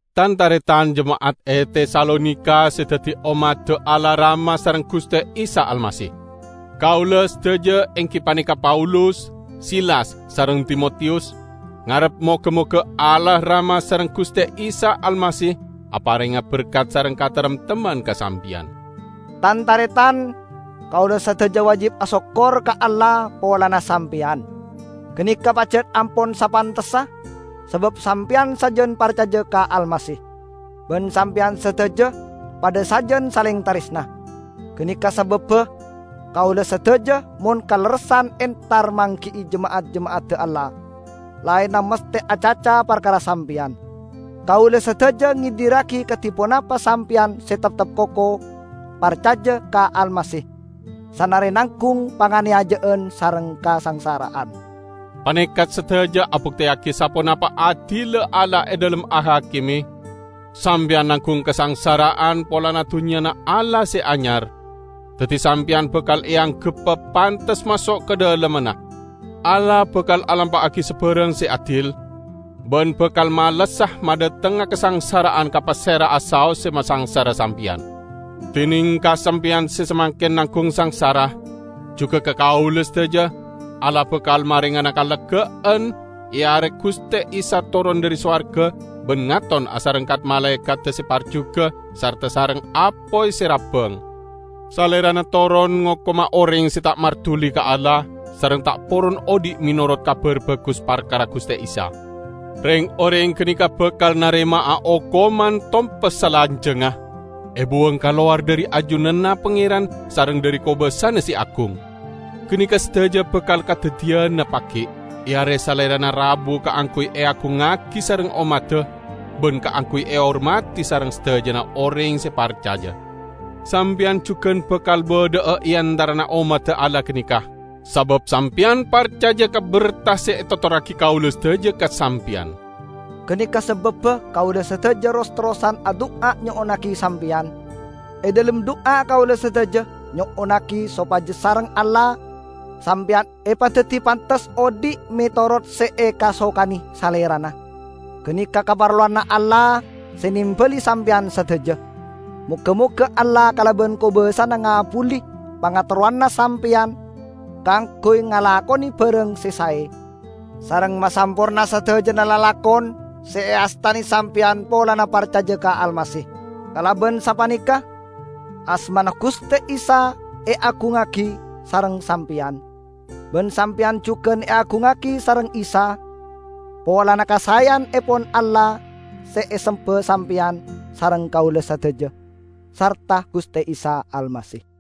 Tan-taretan jema'at e Tesalonika, se daddi ommadda Allah Rama sareng Guste Isa Almasih! Kaula, sadaja, enggi paneka Paulus, Silas sareng Timotiyus ngarep moga-moga Allah Rama sareng Guste Isa Almasih aparenga berkat sareng kataremtemman ka sampeyan. Tan-taretan, kaula sadaja wajib asokkor ka Allah polana sampeyan. Ganeka pajat ampon sapantessa sabab sampeyan sajan parcaja ka Almasih, ban sampeyan sadaja padha sajan saleng taresna. Ganeka sababba kaula sadaja mon kalerressan entar manggi'i jema'at-jema'adda Allah laenna masthe acaca parkara sampeyan. Kaula sadaja ngedirragi kadi ponapa sampeyan se teptep koko parcaja ka Almasih sanare nanggung panganeyaja'an sareng kasangsara'an. Paneka sadaja abukteyagi saponapa adilla Allah e dhalem ahakime: Sampeyan nanggung kasangsara'an polana Dunnyana Allah se Anyar, daddi sampeyan bakal eanggebba pantes maso' ka dhalemmanna. Allah bakal alampa'agi sabarang se adil, ban bakal malessa madhatengnga kasangsara'an ka pasera'a saos se masangsara sampeyan. Dineng ka sampeyan se samangken nanggung sangsara -- jugan ka kaula sadaja -- Allah bakal marengana kalegga'an e are Guste Isa toron dhari sowarga ban ngaton asareng kat-malaekadda se parjuga sarta sareng apoy se rabbang. Salerana toron ngokoma oreng se ta' marduli ka Allah sareng ta' poron odhi' menorot Kabar Bagus parkara Guste Isa. Reng-oreng ganeka bakal narema'a okoman tompes salanjangnga, ebuwang kalowar dhari ajunanna Pangeran sareng dhari kobasana se agung; ganeka sadaja bakal kadaddiyana pagi', e are Salerana rabu kaangguy eagungngagi sareng ommadda, ban kaangguy ehormadi sareng sadajana oreng se parcaja. Sampeyan jugan bakal badha'a e antarana ommadda Allah ganeka, sabab sampeyan parcaja ka berta se etotorragi kaula sadaja ka sampeyan. Ganeka sababba kaula sadaja ros-terrosan adu'a nyo'onnagi sampeyan. E dhalem du'a kaula sadaja nyo'onnagi sopaja sareng Allah sampeyan epadaddi pantes odhi' menorot se ekasokane Salerana; ganeka kaparlowanna Allah se nembali sampeyan sadaja. Moga-moga Allah kalaban kobasana ngabbuli pangaterrona sampeyan kaangguy ngalakone barang se sae, sareng masamporna sadajana lalakon se eastane sampeyan polana parcaja ka Almasih. Kalaban sapaneka asmana Guste Isa eagungngagi sareng sampeyan, ban sampeyan jugan eagungngagi sareng Isa polana kasaeyannepon Allah se esemba sampeyan sareng kaula sadaja sarta Guste Isa Almasih.